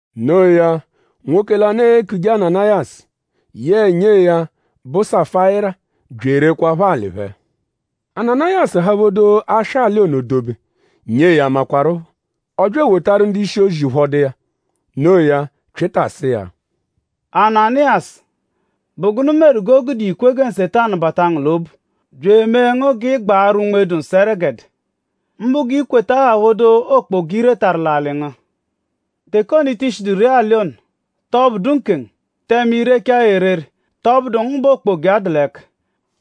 Noo ya; nwoke lanụ, eekuje Ananayasu yẹe nyee ya, bụ Safayira bya erekwaaphọ alị phẹ. Ananayasu haphodo aswa alị ono dobe; nyee ya makwaruphọ. Ọ bya ewotaru ndu-ishi-ozi ụphodu iya. Noo ya; Pyịta sụ iya: “Ananayasu!?Bụ gụnu meru g'o gude i kwe gẹ Nsetanu bata ngu l'obu bya emee ngu g'ị gbaarụ Unme-dụ-Nsọ ẹregede; mbụ g'i kweta haphodo okpoga, i retaru l'alị ngu? Teke ono, i ti shidu ree alị ono;?tọ bụdu nkengu? Tẹme i rechaa ya erere;?tọ bụdu ngu bẹ okpoga iya dụ l'ẹka;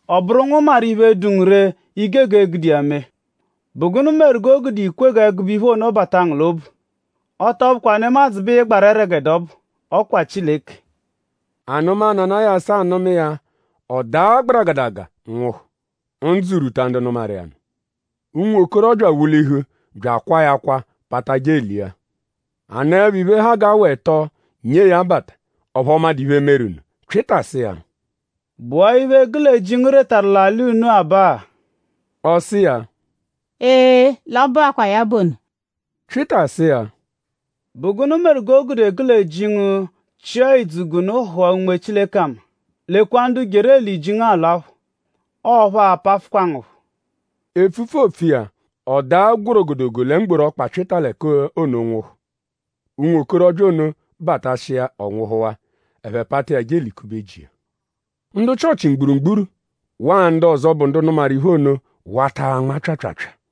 ọ bụru ngu maru iphe, dụ ngu ree, i gege gude iya mee??Bụ gụnu meru g'o gude i kwe g'ẹgube iphe ono bata ngu l'obu? Ọ tọ bụkwa nemadzụ bẹ ị gbarụ ẹregede ọbu; ọ kwa Chileke!” Anụma, Ananayasu anụma iya; ọ daa gbaragadaga nwụhu. Ndzụ rwuta ndu nụmaru iya nụ. Ụnwokorobya wulihu bya akwaa ya akwa pata je elia. A nọepho iphe, ha g'awa ẹto nyee ya bata; ọphu ọ madụ iphe, meru nụ. Pyịta sụ iya: “?Bụwaa iphe, gụ lẹ ji ngu retaru l'alị unu-a baa?” Ọ sụ iya: “Ee; l'ọ bụakwaa ya bụ ono.” Pyịta sụ iya: “?Bụ gụnu meru g'o gude gụ lẹ ji ngu chịa ìdzù g'unu hụa Unme Chileke ama? Lekwa ndu jeru eli ji ngu alwaphọ. Ọo phẹ a-pafụfukwa ngu phọ.” Epfupfu, oopfu iya; ọ daa gwọrogodogo lẹ mgboru ọkpa Pyịta l'ẹka ono nwụhu. Ụnwokorobya ono batashia ọ nwụhuwaa; ẹphe pata iya je elikube ji iya. Ndu Chịochi mgburugburu waa ndu ọzo, bụ ndu nụmaru iphe ono wata anma pyaapyaapyaa.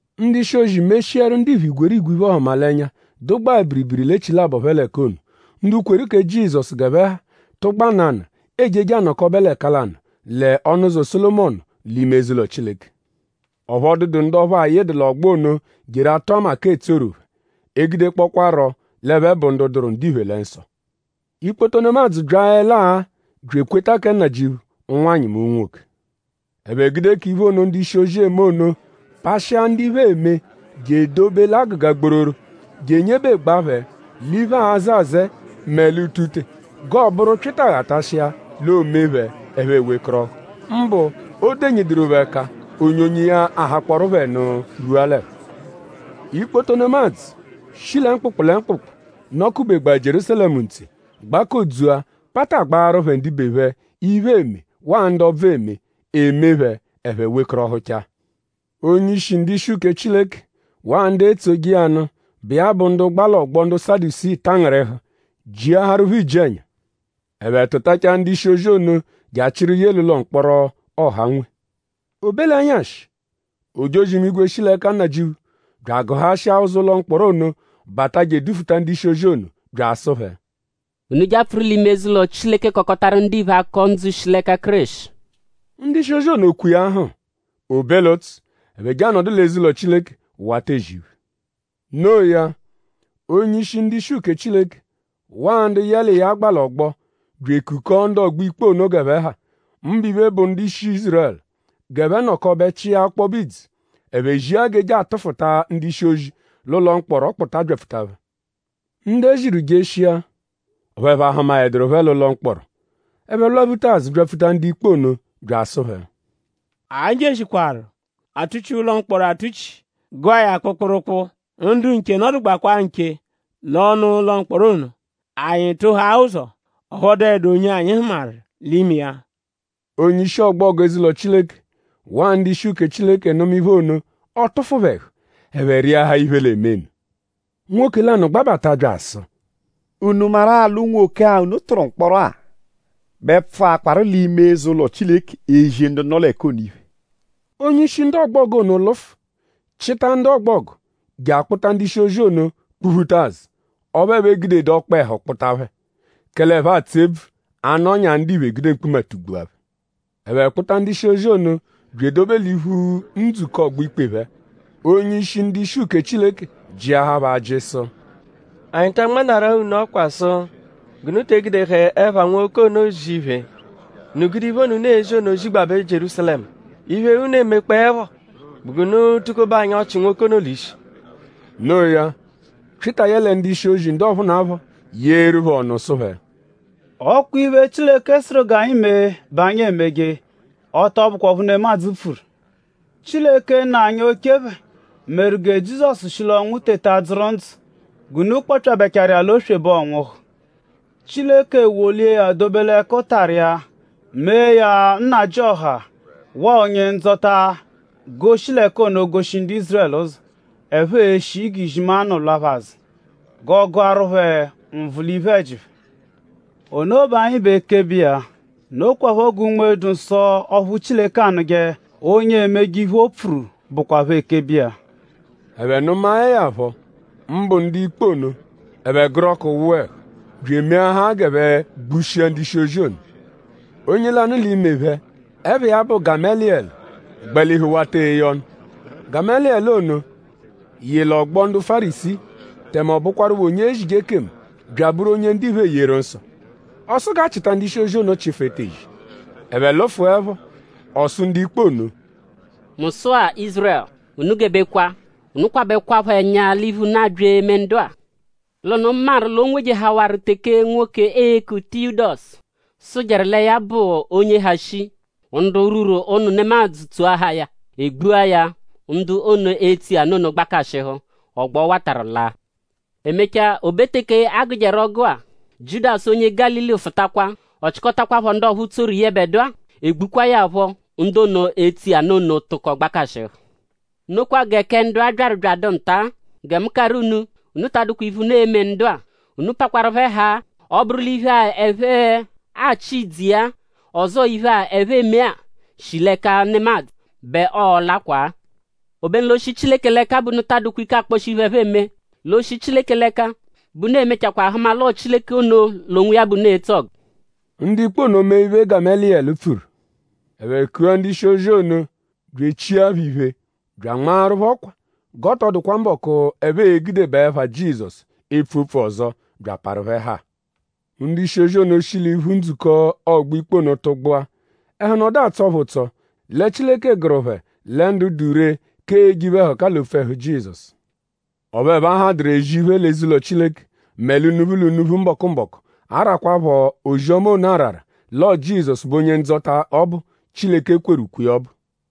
Ndu-ishi-ozi meshiaru ndiphe igwerigwe iphe-ọhumalenya, dụgbaa biribiri l'echilabọ phẹ l'ẹka ono. Ndu kweru kẹ Nnajịuphu g'ẹphe ha tụgba nanụ ejeje anọkobe l'ẹka lanụ lẹ Ọnu-ụzo Sólomọnu; l'ime eze-ụlo Chileke. Ọphu ọ dụdu ndu ọphu ayịdu l'ọgbo ono jeru atụ ama k'etsoru phẹ; egudekpọkwaaro l'ẹphe bụ ndu dụru ndiphe lẹ nsọ. Ikpoto nemadzụ byaẹlaa bya ekweta kẹ Nnajịuphu; ụnwanyi mẹ unwoke. Ẹphe gude k'iphe ono, ndu-ishi-ozi eme ono pashịa ndu iphe, eme je edobe l'agụga gbororo; je enyebegbaa phẹ l'iphe, aazẹ azẹe mẹ l'utute; g'ọo-bụru Pyịta -ghatashia l'o mee phẹ ẹphe ewekọrohu; mbụ o -denyiduru phẹ ẹka; onyonyo iya ahakpọoru phẹ nụ rwua l'ẹhu. Ikpoto nemadzụ, shi lẹ mkpụkpu lẹ mkpụkpu, nọ-kubegbaa Jierúsalẹmu ntse gbakodzua patagbaaru phẹ ndibe phẹ, iphe eme waa ndu ọbvu eme. E mee phẹ ẹphe wekọrohuchaa. Onye-ishi ndu-ishi uke Chileke waa ndu etsoje iya nụ, bụ iya bụ ndu gba l'ọgbo ndu Sadusii tangịrihu; jiaharu phẹ iji-ẹnya. Ẹphe tụtachaa ndu-ishi-ozi ono je achịru ye l'ụlo-mkpọro, ọha nwe. O be l'ẹnyashi; ojozi-imigwe shi l'ẹka Nnajịuphu bya agụhashia ụzo ụlo mkpọro ono bata je edufuta ndu-ishi-ozi ono bya asụ phẹ: “Unu je apfụru l'ime eze-ụlo Chileke kọkotaru ndiphe akọ ndzụ, shi l'ẹka Kéreshi.” Ndu-ishi-ozi ono kwe iya hm. O be l'ụtsu; ẹphe je anọdu l'eze-ụlo Chileke wata ezi iphe. Noo ya; onye-ishi ndu-ishi uke Chileke waa ndu yẹ l'iya gba l'ọgbo bya ekukọo ndu ọgbo-ikpe ono g'ẹphe ha; mbụ iphe, bụ ndu-ishi Ízurẹlu; g'ẹphe nọkobe chịa ọkpobe idzu. Ẹphe zia g'e je atụfuta ndu-ishi-ozi l'ụlo mkpọro kpụta byapfuta phẹ. Ndu e ziru jeshia; ọphu ẹphe ahụmaeduru phẹ l'ụlo mkpọro. Ẹphe lwaphuta azụ byapfuta ndu-ikpe ono bya asụ phẹ: Anyi jeshikwaaru; a tuchia ụlo mkpọro atuchi; gụa ya kpụkpurukpu. Ndu nche nọdugbakwaa nche l'ọnu-ụlo mkpọro ono. Anyi tụhaa ụzo; ọphu ọ dụedu onye anyi hụmaru l'ime iya. Onye-ishi ọgbogu eze-ụlo Chileke waa ndu-ishi uke Chileke nụma iphe ono; ọ tụfu phẹ ẹhu; ẹphe rịahaa iphe, l'e-me nụ. Nwoke lanụ gbabata bya asụ: “?Unu maru-a l'unwoke-a, unu tụru mkpọro-a bẹ pfụakwaru l'ime eze-ụlo Chileke ezi ndu nọ l'ẹka ono iphe.” Onye-ishi ndu ọgbogu ono lụfu chịta ndu ọgbogu je akpụta ndu-ishi-ozi ono kpụ-phuta azụ. Ọphu ẹphe egudedu ọkpehu kpụta phẹ; kẹle ẹphe atsụ ebvu a -nọnyaa ndiphe gude mkpuma tugbua phẹ. Ẹphe kpụta ndu-ishi-ozi ono bya edobe l'iphu ndzukọ ọgbo-ikpe phẹ. Onye-ishi ndu-ishi uke Chileke jịahaa phẹ ajị sụ: “?Anyi ta anmanarụ-a unu ọkwa sụ g'unu te egudehẹ ẹpha nwoke ono ezi iphe? Unu gude iphe ono, unu ezi ono zigbabẹ Jierúsalẹmu. Iphe, unu emekpọepho bụ g'unu tukobe anyi ọchi nwoke ono l'ishi.” Noo ya; Pyịta yẹle ndu-ishi-ozi ndu ọphunapho yeeru phẹ ọnu sụ phẹ: “Ọ kwa iphe, Chileke sụru g'anyi mee bẹ anyi e-meje. Ọ tọ bụkwa ọphu nemadzụ pfuru. Chileke nna anyi oche phẹ; meru gẹ Jizọsu shi l'ọnwu teta dzụru ndzụ g'unu kpọpyabechaaru iya l'oswebe ọ nwụhu. Chileke wolia ya dobe l'ẹkutara iya mee ya Nnajịoha waa Onye-Ndzọta g'oo-shi l'ẹka ono goshi ndu Ízurẹlu ụzo, ẹphe e-shi g'izimanụ lwa phẹ azụ; g'ọ gụaru phẹ nvụ l'iphe-ẹji phẹ. Ono bẹ anyi bụ ekebe iya. Nokwaphọ gẹ Unme-dụ-Nsọ, ọphu Chileke anụje onye emeje iphe, o pfuru bụkwapho ekebe iya.” Ẹphe nụmae ya phọ; mbụ ndu-ikpe ono; ẹphe gụru ọku wụa ẹhu; bya emeahaa g'ẹphe gbushia ndu-ishi-ozi ono. Onye lanụ l'ime phẹ, ẹpha iya bụ Gameliyẹlu gbalihu wata eye ọnu. Gameliyẹlu ono yị l'ọgbo ndu Fárisii; tẹme ọ bụkwarupho onye ezije ekemu; bya abụru onye ndiphe eyeru nsọ. Ọ sụ g'a chịta ndu-ishi-ozi ono chịfu etezi. Ẹphe lụfuepho; ọ sụ ndu-ikpe ono: “Mu sụ-a Ízurẹlu! Unu gebekwa! Unu kwabẹkwapho ẹnya l'iphe, unu abya eme ndu-a. L'unu maru l'o nwejehawaru teke nwoke, eeku Tiyudasu sụjeru lẹ ya bụ onye ha shii. Ndu rwuru ụnu nemadzụ tsoahaa ya. E gbua ya. Ndu ono, etso iya nụ ono gbakashịhu. Ọgbo, ọ watarụ laa. E mechaa; o be teke a gụjeru ọgu-a; Jiudasu onye Gálili fụtakwa. Ọ chịkotakwapho ndu ọphu tsoru yẹbedua. E gbukwaa ya phọ. Ndu ono, etsoje iya nụ ono tụko gbakashịhu. Nokwa gẹ kẹ ndu-a byaru bya adụ nta. Gẹ mu karụ unu; unu ta adụkwa iphe, unu e-me ndu-a. Unu pakwarụ phẹ haa. Ọ -bụru l'iphe-a, ẹphe achị idzu iya-a; ọzoo iphe-a, ẹphe eme-a shi l'ẹka nemadzụ bẹ ọo-lakwa-a. Obenu l'o -shi Chileke l'ẹka bẹ unu taa dụkwa ike akpọshi iphe, ẹphe eme. L'o -shi Chileke l'ẹka bẹ unu e-mechakwaa hụma l'ọo Chileke ono l'onwiya bẹ unu etso ọgu.” Ndu-ikpe ono mee iphe, Gameliyẹlu pfuru. Ẹphe kua ndu-ishi-ozi ono bya e chia phẹ iphe bya anmaaru phẹ ọkwa g'ọ tọ dụkwa mbọku, ẹphe e-gudebaa ẹpha Jizọsu epfu opfu ọzo; bya aparu phẹ haa. Ndu-ishi-ozi ono shi l'iphu ndzukọ ọgbo-ikpe ono tụgbua. Ẹhu nọdu atsọ phẹ ụtso lẹ Chileke gụru phẹ lẹ ndu dụ ree k'eje iphe-ẹhuka l'opfu ẹhu Jizọsu. Ọphu ẹphe ahadụru ezi iphe, l'eze-ụlo Chileke mẹ l'unuphu l'unuphu mbọku-mbọku arakwaphọ ozi-ọma ono arara l'ọo Jizọsu bụ Onye-Ndzọta ọbu, Chileke kweru ukwe iya ọbu.